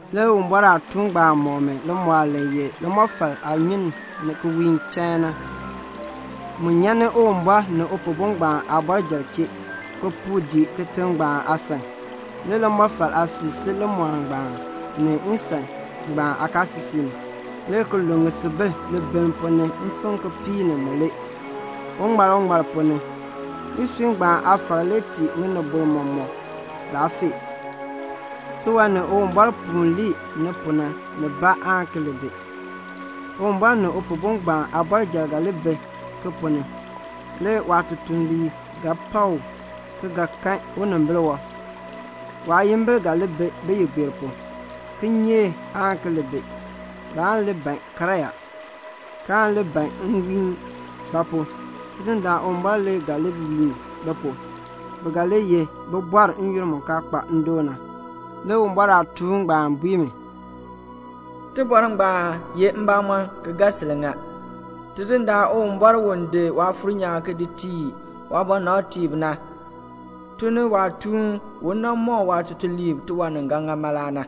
Le Uwumbɔr aatuun ngbaan mɔk mi limɔɔl li ye limɔfal aanyun ki wiin chain na. Mu nyan ni Uwumbɔr ni Upihbo ngbaan aabɔrjal, ki puu dii kitiŋ ngbaan aasan. Le limɔfal aasui si limɔɔl ngbaan, ni nsan ngbaan aakaasisik ni, le ki lun ŋisubil libiln ponn ni mfim kipiik ni mulee, uŋmal uŋmal ponn ni. Isui ngbaan aafar le tii ŋinibol mɔk laafee. Tiwan ni Uwumbɔr puun lii ni pu na nibaa aan ki li bi. Uwumbɔr ni Upihbo ngbaan aabɔrjal ga li bi ki ponn ni; le waatutuliib ga pak u, ki ga kan unimbil wɔb. Waayimbil ga li bi biyigbeer pu. Kinyeek aan ki li bi. Baan li ban karyaa, kaan li ban nwiin; ba pu? Tidindaan Uwumbɔr le ga li wiin bi pu. Bi ga li ye bibɔrb n-yoonn mu kaa kpa ndoon na. Le Uwumbɔr aatuun ngbaan bui mi, "Iliin ngbaan ye mbamɔn ki ga sil ŋa. Tidindaan Uwumbɔr u di Waafuur nyaan ki di tii waabɔnabtiib na tun ni waatuun u nan mɔk waatutuliib tiwan ni ga ŋa mala na."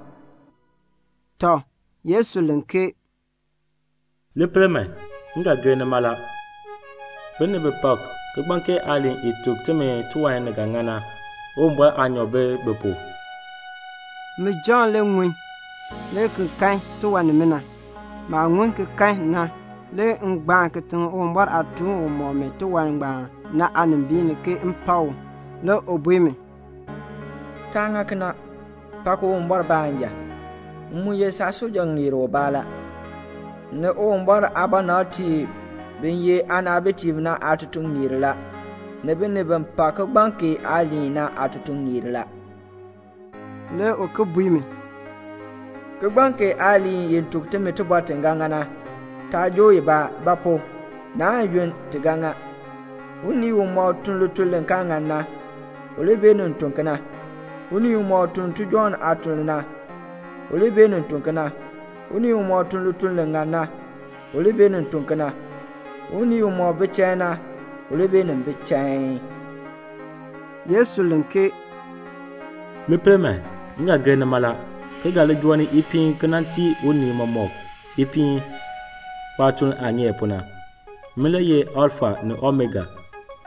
Tɔ, Yesu len ke "Li pel man, m ga gir ni mala. Binib bi pak kigbaŋ kee aaliin i tuk timi tiwan ni ga ŋa na, Uwumbɔr aanyoor bi bi pu." Min Jɔnn le ŋun le ki kan tiwan nimina. Maah ŋun ki kan na, le m gbaan kitiŋ Uwumbɔr aatuun u mɔk mi tiwan ngbaan na aanimbiin ni ke m pak u. Le u bui mi, "Taa ŋa kena. Pak Uwumbɔr baanja. M mu ye saatutuŋeer ubaa la, ni Uwumbɔr aabɔnabtiib bi ye aanaabitiib na aatutuŋeer la, ni binib bi pak kigbaŋ kee aaliin na aatutuŋeer la." Le u ki bui mi, "Kigbaŋ kee aaliin i tuk timi tibɔr ti ga ŋa na, taa joo i aabaa; ba pu? naan yunn ti ga ŋa. Unii umɔk tun lituln li kaa ŋan na, u li beenin tun kena. Unii umɔk tun tijɔŋ aatuln na, u li beenin tun kena. Unii umɔk tun lituln li ŋan na, u li beenin tun kena. Unii umɔk bi chain na, u li beenin bi chain." Yesu len, "Li pel man, m ga gir ni mala, ki ga li joo ni ipiin ki nan tii unii mɔmɔk ipiin waatuln aah ŋeer pu na. Min le ye Alfa ni Omega,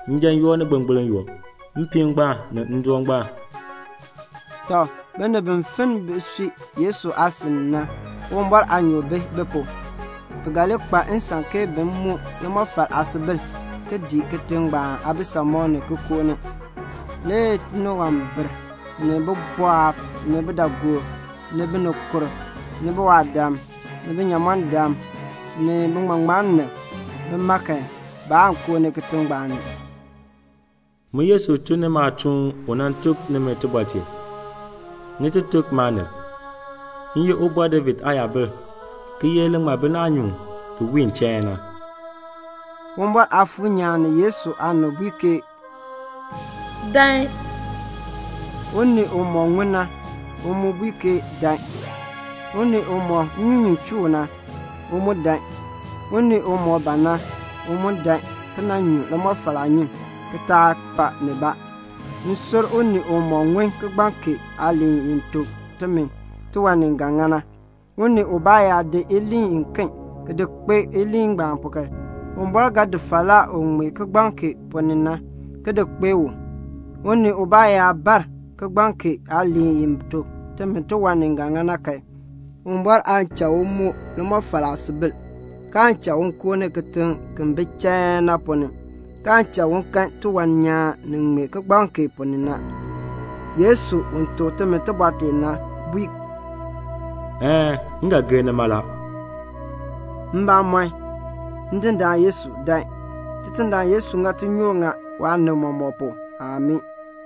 njan yoo ni gbilngbiln yoo, mpiin ngbaan ni ndoon ngbaan." Tɔ, binib bi finn bisui Yesu aasin na, Uwumbɔr aanyoor bi bi pu. Bi ga li kpa nsan ke bin moo limɔfal aasubil, ki dii kitiŋ ngbaan aabisamɔb ki koo ni. Le tiniwambir, ni bibɔɔb, ni bidaagoob, ni binikurb, ni biwaadam, ni binyamɔndam, ni biŋmaŋmannim, bima kan, baan koo kitiŋ ngbaan ni. "Min Yesu tun ni maatuun u nan tuk nimi tibɔr tee, ni ti tuk maanib. M ye Ubɔr David aayabil, ki ye naanyuun u wiin chain na." Uwumbɔr Aafuur nyaan ni Yesu aanib bui ke "Dan." Unii umɔk ŋun na, u mu bui ke "Dan." Unii umɔk nnyunyun chuu u na, u mu dan. Unii umɔk ban na, u mu dan ki nan nyu limɔfal aanyun, ki taa pa nibaa. M sur unii umɔk ŋun kigbaŋ kee aaliin i tuk timi tiwan ni ga ŋa na, unii ubaa yaa di iliin iken ki di kpee iliin ngbaan pu kan, Uwumbɔr ga di falaa u ŋmee kigbaŋ kee ponn ni na ki di kpee u. Unii ubaa yaa bar kigbaŋ kee aaliin i tuk timi tiwan ni ga ŋa na kan, Uwumbɔr aan cha u moo limɔfal aasubil, kaan cha u koo ni kitiŋ ki bi chain na ponn ni, kaan cha u kan tiwan nyaan ni ŋmee kigbaŋ kee ponn ni na. Yesu u tuk timi tibɔr tee na bui, "Een, m ga gir ni mala." Ndindaan Yesu, amii, dan. Tidindaan Yesu ŋa tinyoor ŋa waanib mɔmɔk pu. Amii.